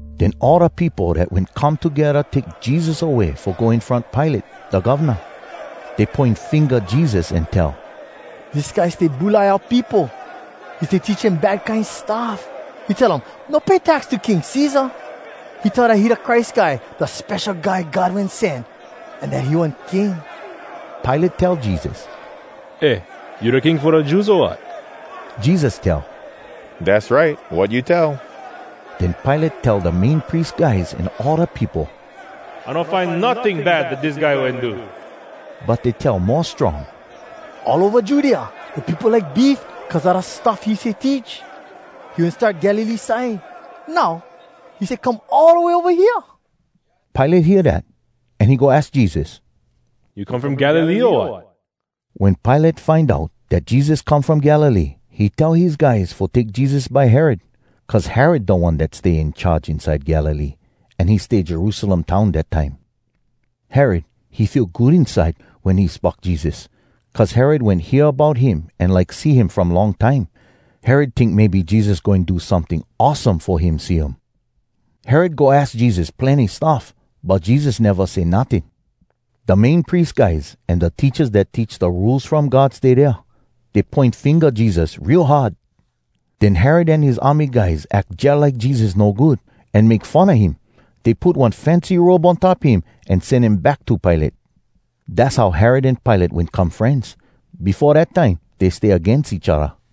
Den all da peopo dat wen come togedda take Jesus away fo go in front Pilate, da govna. Dey poin finga Jesus an tell, “Dis guy stay bulai oua peopo! He stay teach dem bad kine stuff. He tell dem no pay tax to King Cesar! He tell dat he da Christ Guy, da Spesho Guy God Wen Sen, an dat he one king.” Pilate tell Jesus, “Eh, you da king fo da Jews, o wat?” Jesus tell, “Dass right, wat you tell.” Den Pilate tell da Main Pries guys an all da peopo, “I no find notting bad dat dis guy wen do.” But dey tell mo strong, “All ova Judea da peopo like beef cuz a da stuff he stay teach. He wen start Galilee side. Now, he stay come all da way ova hea.” Pilate hear dat, an he go aks Jesus, “You come from Galilee, o wat?” Wen Pilate find out dat Jesus come from Galilee, he tell his guys fo take Jesus by Herod. Cuz Herod da one dat stay in charge inside Galilee, an he stay Jerusalem town dat time. Herod, he feel good inside wen he spock Jesus, cuz Herod wen hear bout him an like see him from long time. Herod tink maybe Jesus goin do someting awesome fo him see um. Herod go aks Jesus plenny stuff, but Jesus neva say notting. Da Main Pries guys an da teachas dat teach da Rules From God stay dea. Dey poin finga Jesus real hard. Den Herod an his army guys ack jalike Jesus no good, an make fun a him. Dey put one fancy robe on top him, an sen him back to Pilate. Dass how Herod an Pilate wen come frenz. Befo dat time dey stay agains each odda.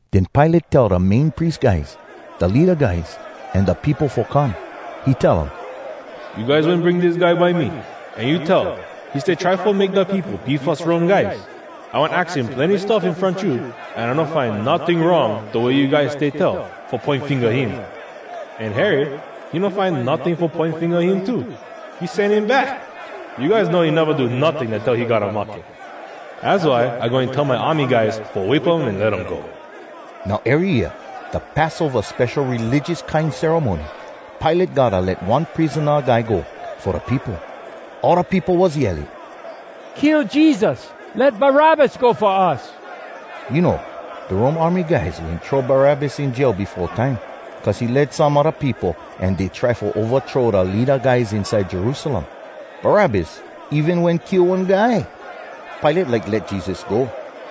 Den Pilate tell da Main Pries guys, da leada guys, an da peopo fo come. He tell um, “You guys wen bring dis guy by me, an you tell he stay try fo make da peopo beef us Rome guys. I wen aks him plenny stuff in front you, an I no find notting wrong da way you guys stay tell, fo poin finga him. An Herod, he no find notting fo poin finga him too. He sen him back. You guys know he neva do notting dat tell he gotta mahke. Az why I goin tell my army guys fo whip um an let um go.” [Now, ery year, da Passova spesho religious kine ceremony, Pilate gotta let one prisona guy go fo da peopo.] All da peopo was yelling, “Kill Jesus! Let Barabbas go fo us!” You know, da Rome army guys wen throw Barabbas in jail befo time, cuz he lead some a da peopo an dey try fo ovathrow da leada guys inside Jerusalem. Barabbas even wen kill one guy. Pilate like let Jesus go,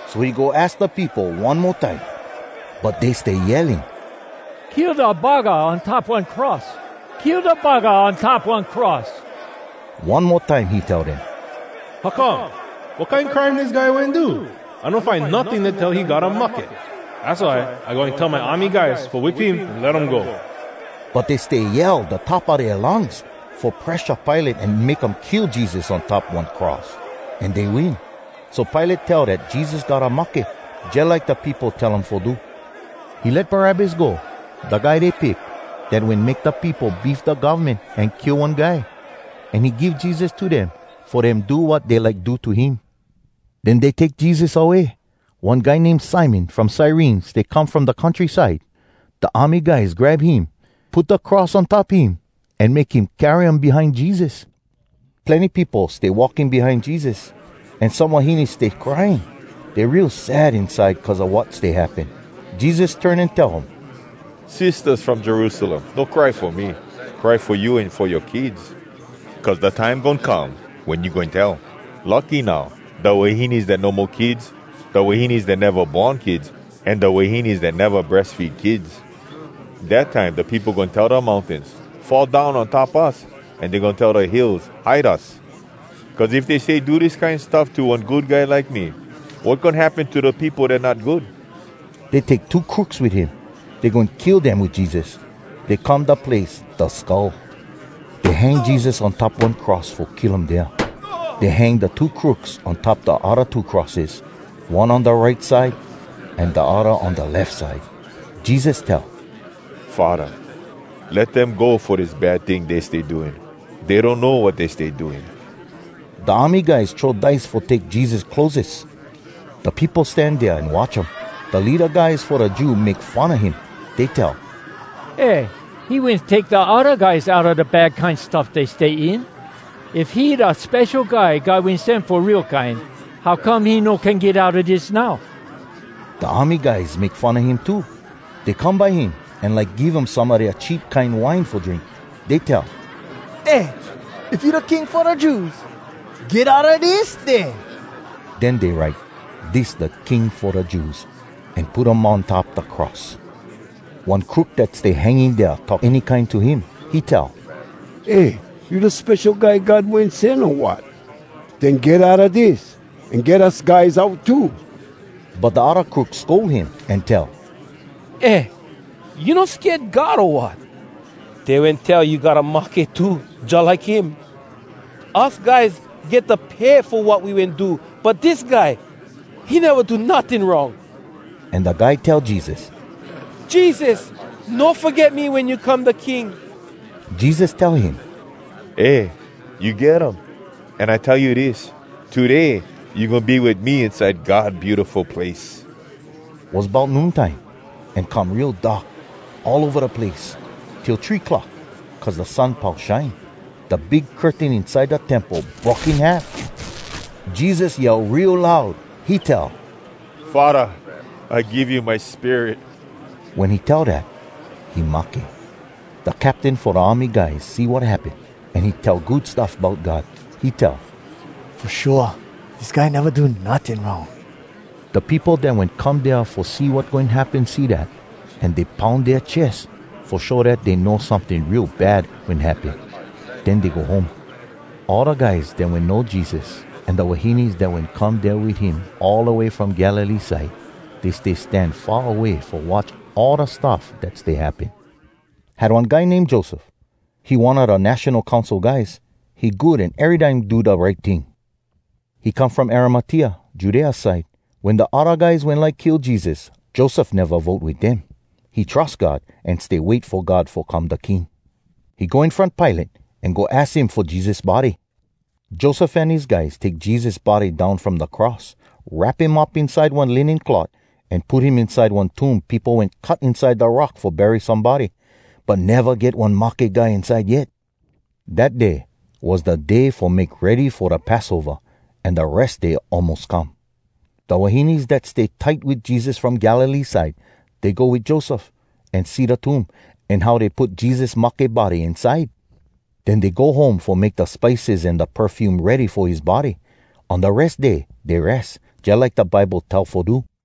so he go aks da peopo one mo time. But dey stay yelling, “Kill da buggah on top one cross! Kill da buggah on top one cross!” One mo time he tell dem, “How come? Wat kine crime dis guy wen do? I no find notting dat tell he gotta mahke. Az why I goin tell my army guys fo whip him an let um go.” But dey stay yell da top a dea lungs, fo presha Pilate an make um kill Jesus on top one cross, an dey win. So Pilate tell dat Jesus gotta mahke, jalike da peopo tell um fo do. He let Barabbas go, da guy dey pick, dat wen make da peopo beef da govmen an kill one guy. An he give Jesus to dem fo dem do wat dey like do to him. Den dey take Jesus away. One guy name Simon from Cyrene stay come from da countryside. Da army guys grab him, put da cross on top him, an make him carry um behind Jesus. Plenny peopo stay walking behind Jesus, an some wahines stay crying. Dey real sad inside cuz a wat stay happen. Jesus turn an tell um, “Sistahs from Jerusalem, no cry fo me. Cry fo you an fo yoa kids. Cuz da time goin come wen you goin tell, ‘Lucky now, da wahines dat no mo kids, da wahines dat neva born kids, an da wahines dat neva breas feed kids!’ Dat time da peopo goin tell da mountains, ‘Fall down on top us!’ An dey goin tell da hills, ‘Hide us!’ Cuz if dey stay do dis kine stuff to one good guy like me, wat goin happen to da peopo dat not good?” Dey take two crooks wit him. Dey goin kill dem wit Jesus. Dey come da place “Da Skull.” Dey hang Jesus on top one cross fo kill um dea. Dey hang da two crooks on top da odda two crosses, one on da right side an da odda on da lef side. Jesus tell, “Faddah, let dem go fo dis bad ting dey stay doing. Dey donno wat dey stay doing!” Da army guys throw dice fo take Jesus clotheses. Da peopo stan dea an watch um. Da leada guys fo da Jews make fun a him. Dey tell, “Eh, he wen take da odda guys outa da bad kine stuff dey stay in. If he da Spesho Guy God Wen Sen fo real kine, how come he no can get outa dis now?!” Da army guys make fun a him too. Dey come by him an like give him some a dea cheap kine wine fo drink. Dey tell, “Eh, if you da king fo da Jews, get outa dis, den!” Den dey write, DIS DA KING FO DA JEWS an put um on top da cross. One crook dat stay hanging dea talk any kine to him. He tell, “Eh, you da Spesho Guy God Wen Sen, o wat? Den get outa dis, an get us guys out too!” But da odda crook scold him, an tell, “Eh, you no sked God, o wat? Dey wen tell you gotta mahke, too, jalike him. Us guys get da pay fo wat we wen do, but dis guy, he neva do notting wrong!” An da guy tell Jesus, “Jesus, no foget me wen you come da King!” Jesus tell him, “Eh, you get um! An I tell you dis: Today you goin be wit me inside God Beautiful Place.” Was bout noon time, an come real dark all ova da place, till three clock, cuz da sun pau shine. Da big curtain inside da Temple broke in half. Jesus yell real loud. He tell, “Faddah! I give you my spirit!” Wen he tell dat, he mahke. Da captain fo da army guys see wat happen, an he tell good stuff bout God. He tell, “Fo shua, dis guy neva do notting wrong!” Da peopo dat wen come dea fo see wat goin happen see dat, an dey poun dea ches, fo show dat dey know someting real bad wen happen. Den dey go home. All da guys dat wen know Jesus, an da wahines dat wen come dea wit him all da way from Galilee side, dey stay stand far away fo watch all da stuff dat stay happen. Had one guy name Joseph. He one a da National Council guys. He good an erytime do da right ting. He come from Arimatea, Judea side. Wen da odda guys wen like kill Jesus, Joseph neva vote wit dem. He trus God, an stay wait fo God fo come da king. He go in front Pilate, an go aks him fo Jesus body. Joseph an his guys take Jesus body down from da cross, wrap him up inside one linen cloth, an put him inside one tomb peopo wen cut inside da rock fo bury somebody, but neva get one mahke guy inside yet. Dat day was da Day Fo Make Ready Fo Da Passova, an da Res Day almos come. Da wahines dat stay tight wit Jesus from Galilee side, dey go wit Joseph, an see da tomb, an how dey put Jesus mahke body inside. Den dey go home fo make da spices an da perfume ready fo his body. On da Res Day dey res, jalike da Bible tell fo do.